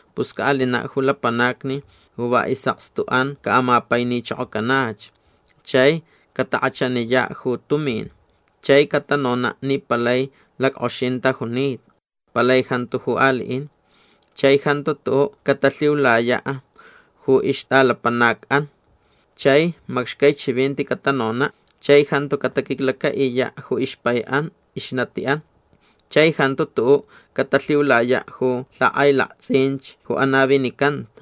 Pus caʼalinaʼ ju lapanacni ju va isʼakstuʼan caʼamapainichokocanach. Chai catakʼachaniyaʼ ju tumin. Chai catanonaʼ ni palai lackʼoxin tajunita. Palai jantu ju aliʼin. Chai jantu tuʼuʼ catalhiulayaʼ ju ixtʼalapanacʼan. Chai macxcai chivinti catanonaʼ. Chai jantu cataquiclacaʼiyaʼ ju ixpaiʼan ixnatiʼan. Chai jantu tuʼuʼ catalhiulayaʼ ju lhakʼailaktsʼinch ju anavinicanta.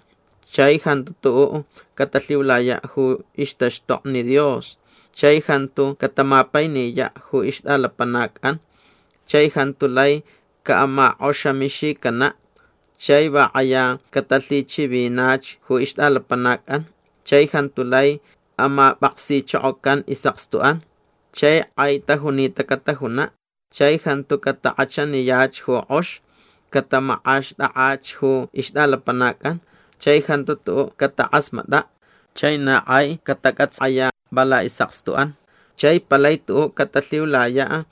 Chai jantu tuʼuʼ catalhiulayaʼ ju ixtaxtokni Dios. Chai jantu catamapainiyaʼ ju ixtʼalapanacʼan. Chai jantu lai caʼamakʼoxamixicanaʼ. Chai va kʼaya catalhichivinach ju ixtʼalapanacʼan. Chai jantu lai amapʼaksichokocan isʼakstuʼan. Chai kʼai tajunita catajunaʼ. Chai jantu catakʼachaniyach ju kʼox. Catamakʼaxtʼakʼach ju ixtʼalapanacʼan. Chai jantu tuʼuʼ catakʼasmatʼaʼ. Chai na kʼai catacʼatsayaʼ va laʼisʼakstuʼan. Chai palai tuʼuʼ catalhiulayaʼ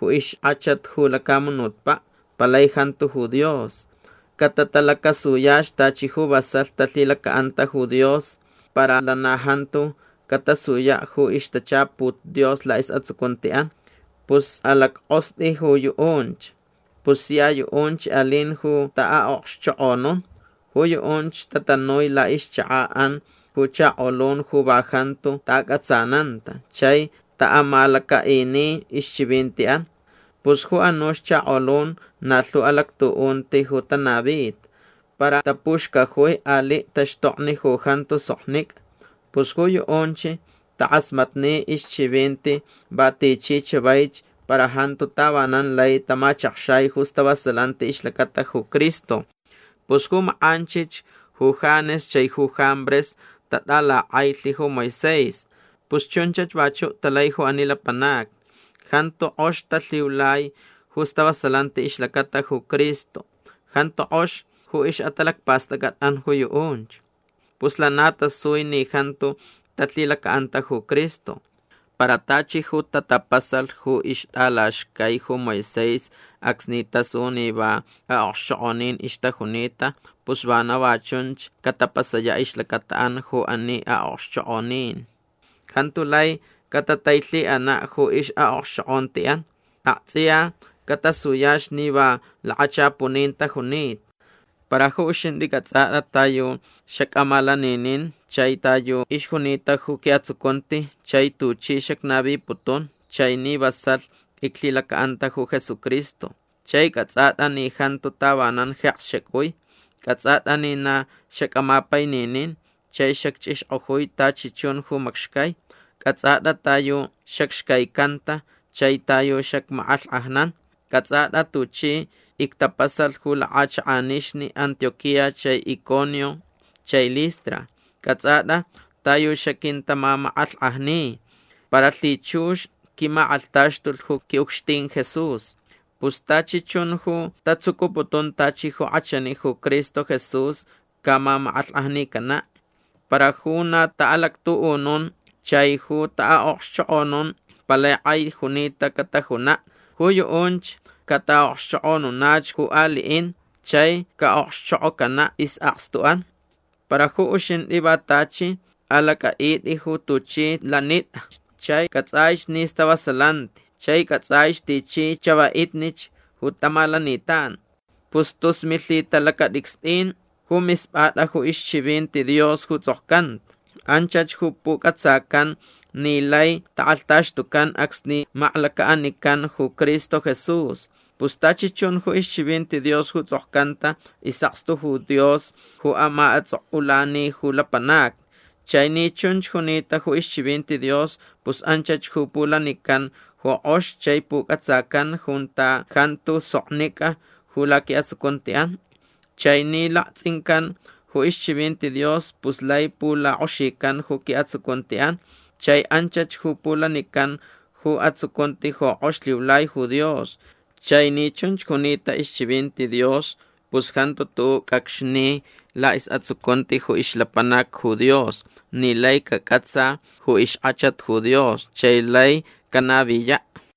ju ixkʼachat ju lacamunutpaʼ. Palai jantu ju Dios. Catatalacasuyach tachi ju vasalh talhilacaʼanta ju Dios para lana jantu catasuyaʼ ju ixtachaput Dios laʼisʼatsucuntiʼan. Pus alackʼostʼi ju yuʼunch. Pus sia yuʼunch alin ju taʼaʼokxchokʼonun. Ju yuʼunch tatanui laʼixchakaʼan ju chakolun ju va jantu taʼacʼatsananta chai taʼamalacaʼini ixchivintiʼan. Pus ju anuch chakolun na lhu alactuʼunti ju tanavita. Para tapuxcajui aliʼ taxtokni ju jantu soknicʼa. Pus ju yuʼunch takʼasmatni ixchivinti va tichi chavaich para jantu tavanan lai tamachakxai ju stavasalanti ixlacata ju Cristo. Pus ju makʼanchich ju Janes chai ju Jambres tatʼalakʼailh ju Moisés. Pus chunchach vachuʼ talai ju ani lapanacni. Jantu kʼox talhiulai ju stavasalanti ixlacata ju Cristo. Jantuch kʼox ju ixʼatalacpastʼacʼatʼan ju yuʼunch. Pus lana tasui ni jantu talhilacaʼanta ju Cristo. Para tachi ju tatapasalh ju ixtʼalaxcai ju Moisés acsni tasu ni va aʼokxchokʼonin ixtajunita pus vana va chunch catapasayaʼ ixlacataʼan ju ani aʼokxchokʼonin. Jantu lai catatailhiʼanaʼ ju ixʼaʼokxchokʼontiʼan. Aktsʼiya catasuyach ni va lakachapunin tajunita. Para ju uxintʼi cʼatsʼatʼa ta yu xacʼamalaninin chai ta yu ixjunita ju quiʼatsucunti chai tuchi xacnaviputun chai ni vasalh iclhilacaʼanta ju Jesucristo. Chai cʼatsʼatʼa ni jantu tavanan jeks xacʼui. Cʼatsʼatʼa ni na xacʼamapaininin chai xacchʼixkʼojui tachi chun ju macxcai. Cʼatsʼatʼa ta yu xacxcaicanta chai ta yu xacmakʼalhkʼajnan. Cʼatsʼatʼa tuchi ictapasalh ju lakʼachakʼanixni Antioquía chai Iconio chai Listra. Cʼatsʼatʼa ta yu xaquintamamakʼalhkʼajni. Para lhichux quimakʼalhtaxtulh ju quiʼucxtin Jesús. Pus tachi chun ju tatsucuputun tachi ju kʼachani ju Cristo Jesús camamakʼalhkʼajnicanaʼ. Para ju na taʼalactuʼunun chai ju taʼaʼokxchokʼonun palai kʼai junita catajunaʼ. Ju yuʼunch cataʼaʼokxchokʼonunach ju aliʼin chai caʼokxchokʼocanaʼ isʼakstuʼan. Para ju uxintʼi va tachi alacʼaʼitʼi ju tuchi lanitʼach chai cʼatsʼaich ni stavasalanti chai cʼatsʼaich tichi chavaʼitnich ju tamalanitan. Pus tus milhitalacatʼicstʼin ju mispʼatʼa ju ixchivinti Dios ju tsʼokcanta. Anchach ju pucʼatsacan ni lai takʼalhtaxtucan acsni maklacaʼanican ju Cristo Jesús. Pus tachi chun ju ixchivinti Dios ju tsʼokcanta isʼakstu ju Dios ju amaʼatsʼokʼulani ju lapanacni. Chai ni chunch junita ju ixchivinti Dios pus anchach ju pulanican ju kʼox chai pucʼatsacan junta jantu soknicʼa ju laquiʼatsucuntiʼan. Chai ni laktsʼincan ju ixchivinti Dios pus lai pulakʼoxican ju quiʼatsucuntiʼan. Chai anchach ju pulanican ju atsucunti ju kʼox lhiulai ju Dios. Chai ni chunch junita ixchivinti Dios pus jantu tuʼuʼ cʼacxni laʼisʼatsucunti ju ixlapanac ju Dios ni lai cacʼatsa ju ixkʼachat ju Dios chai lai canaviyaʼ.